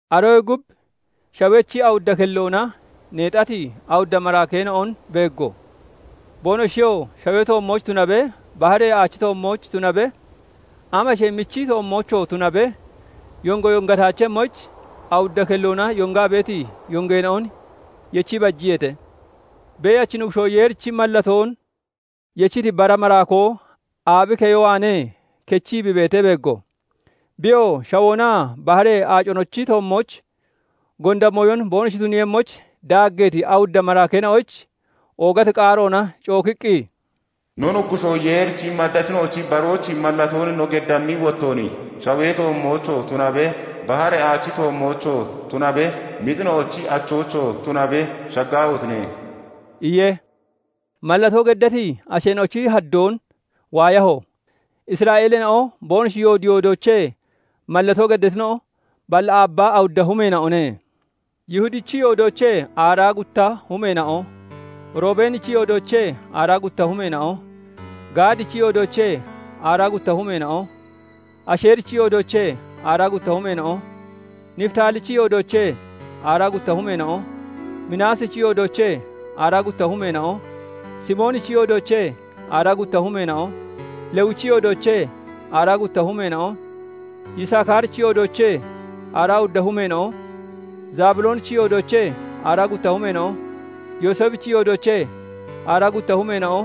Aroyee gub shawechi awudda kelloona neexati awudda maraakeena'on beeggo; boonoshiyoo shawee toommooch tunabe, baharee aachi toommooch tunabe, amashee michi toommoochoo tunabe, yongo yongataachemmoyich awudda kelloona yongaa beeti yongeena'on yechii bajiyeete. Beeyachi Nuggushoo Yeerichi mallatoon yechiti bara maraakoo aabi keyo waanee kechii bi beetee beeggo; biyoo shawoonaa baharee aaconochi toommooch gonda mooyon boonoshi tuniiyemmoyich daaggeeti awudda maraakeena'oyich oogati qaaroona cookiqqi, "No Nuggushoo Yeerichi maddachina'o barooch mallatoon no geddammi wottoon, shawee toommoochoo tunabe, baharee aachi toommoochoo tunabe, mixina'ochi achoochoo tunabe shaggaahotine!" iye. Mallatoo geddati asheena'ochi haddoon waayaho; Isra'eeleena'o boonoshi yoodi yoodoochee mallatoo geddatina'o balli aabbaa awudda humeena'one. Yihudichi yoodoochee aaraa gutta humeena'o, Roobenichi yoodoochee aaraa gutta humeena'o, Gaadichi yoodoochee aaraa gutta humeena'o, Asheerichi yoodoochee aaraa gutta humeena'o, Nifitaalichi yoodoochee aaraa gutta humeena'o, Minaasichi yoodoochee aaraa gutta humeena'o, Simoonichi yoodoochee aaraa gutta humeena'o, Lewichi yoodoochee aaraa gutta humeena'o, Yisakaarichi yoodoochee aaraa gutta humeena'o, Zebuloonichi yoodoochee aaraa gutta humeena'o, Yooseefichi yoodoochee aaraa gutta humeena'o,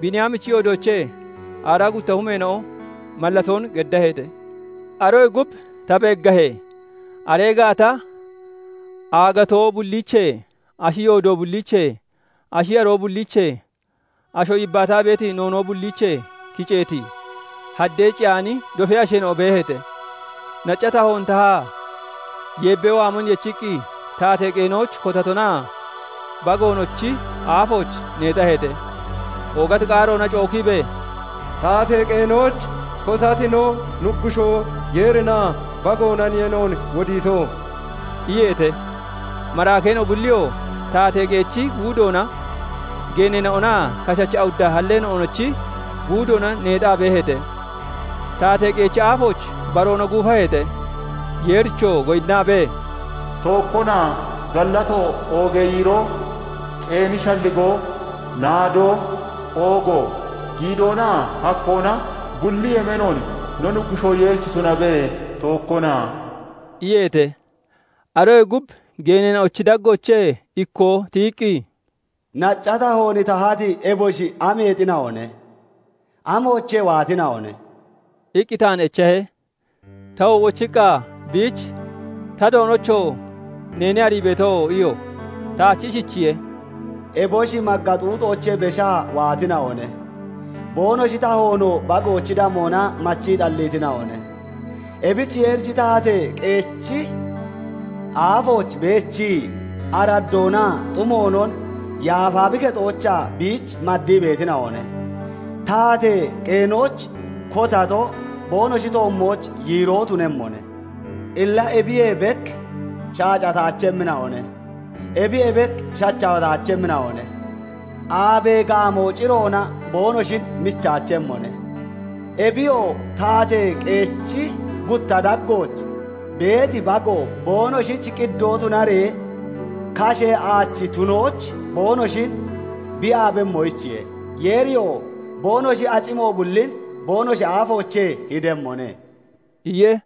Biiniyaamichi yoodoochee aaraa gutta humeena'o mallatoon geddaheete. Aroyee gub ta beeggahee, aree gaata aagatoo bulliichee, ashi yoodo bulliichee, ashi yaroo bulliichee, asho yibbaataa beeti noonoo bulliichee kiceeti, haddee ciyaani dofee asheena'o beeheete. Nacca tahoon tahaa yeebbee waamon yechiqqi taatee qeenooch kotatonaa Bagoonochi aafooch neexaheete. Oogati qaaroona cookiibee, "Taatee qeenooch kotati no Nuggushoo Yeerinaa Bagoonaniye noon wodiito" iyeete. Maraakeena'o bulliyoo taatee qeechi guudoona, geeneena'onaa kashachi awudda halleena'onochi guudoona neexaa beeheete; taatee qeechi aafooch baroona guufaheete; Yeerichoo goyinnaabee, "Tookkona, gallato, oogee yiiroo, ceeni shalligoo, naadoo, oogo, giidoonaa hakkoona bulli yemeenoon no Nuggushoo Yeerich tunabe; tookkona!" iyeete. Aroyee gub geeneena'ochi daggoochee ikkoo tiyiqqi, "Nacca tahoon tahati eboshi ameexina'one? Amoochee waatina'one?" iqqi taan echahe. Tawoo wochiqqa biich "Ta Doonocho! Neene arii beeto" iyo. Taach ishichiye:- "Eboshi magga xuuxoochee beshaa waatina'one; boonoshi tahoonoo Bagoochi damoona machii xalliitina'one. Ebich Yeerichi taatee qeechi aafooch beechii, araddoonaa xumoonon yaafa bi kexoochaa biich maddii beetina'one; taatee qeenooch kotatoo boonoshi toommooch yiiroo tunemmone; Illa ebiyee bek shaacataachemmina'one; ebiyee bek shachawataachemmina'one; aabee gaamoo ciroona boonoshin michaachemmone. Ebiyoo, taatee qeechi gutta daggooch beeti Bago boonoshich qiddoo tunaree, kashee aachi tunooch boonoshin bi yaabemmoyichiye; Yeeriyoo boonoshi acimo bullin boonoshi aafoochee hidemmone" iye.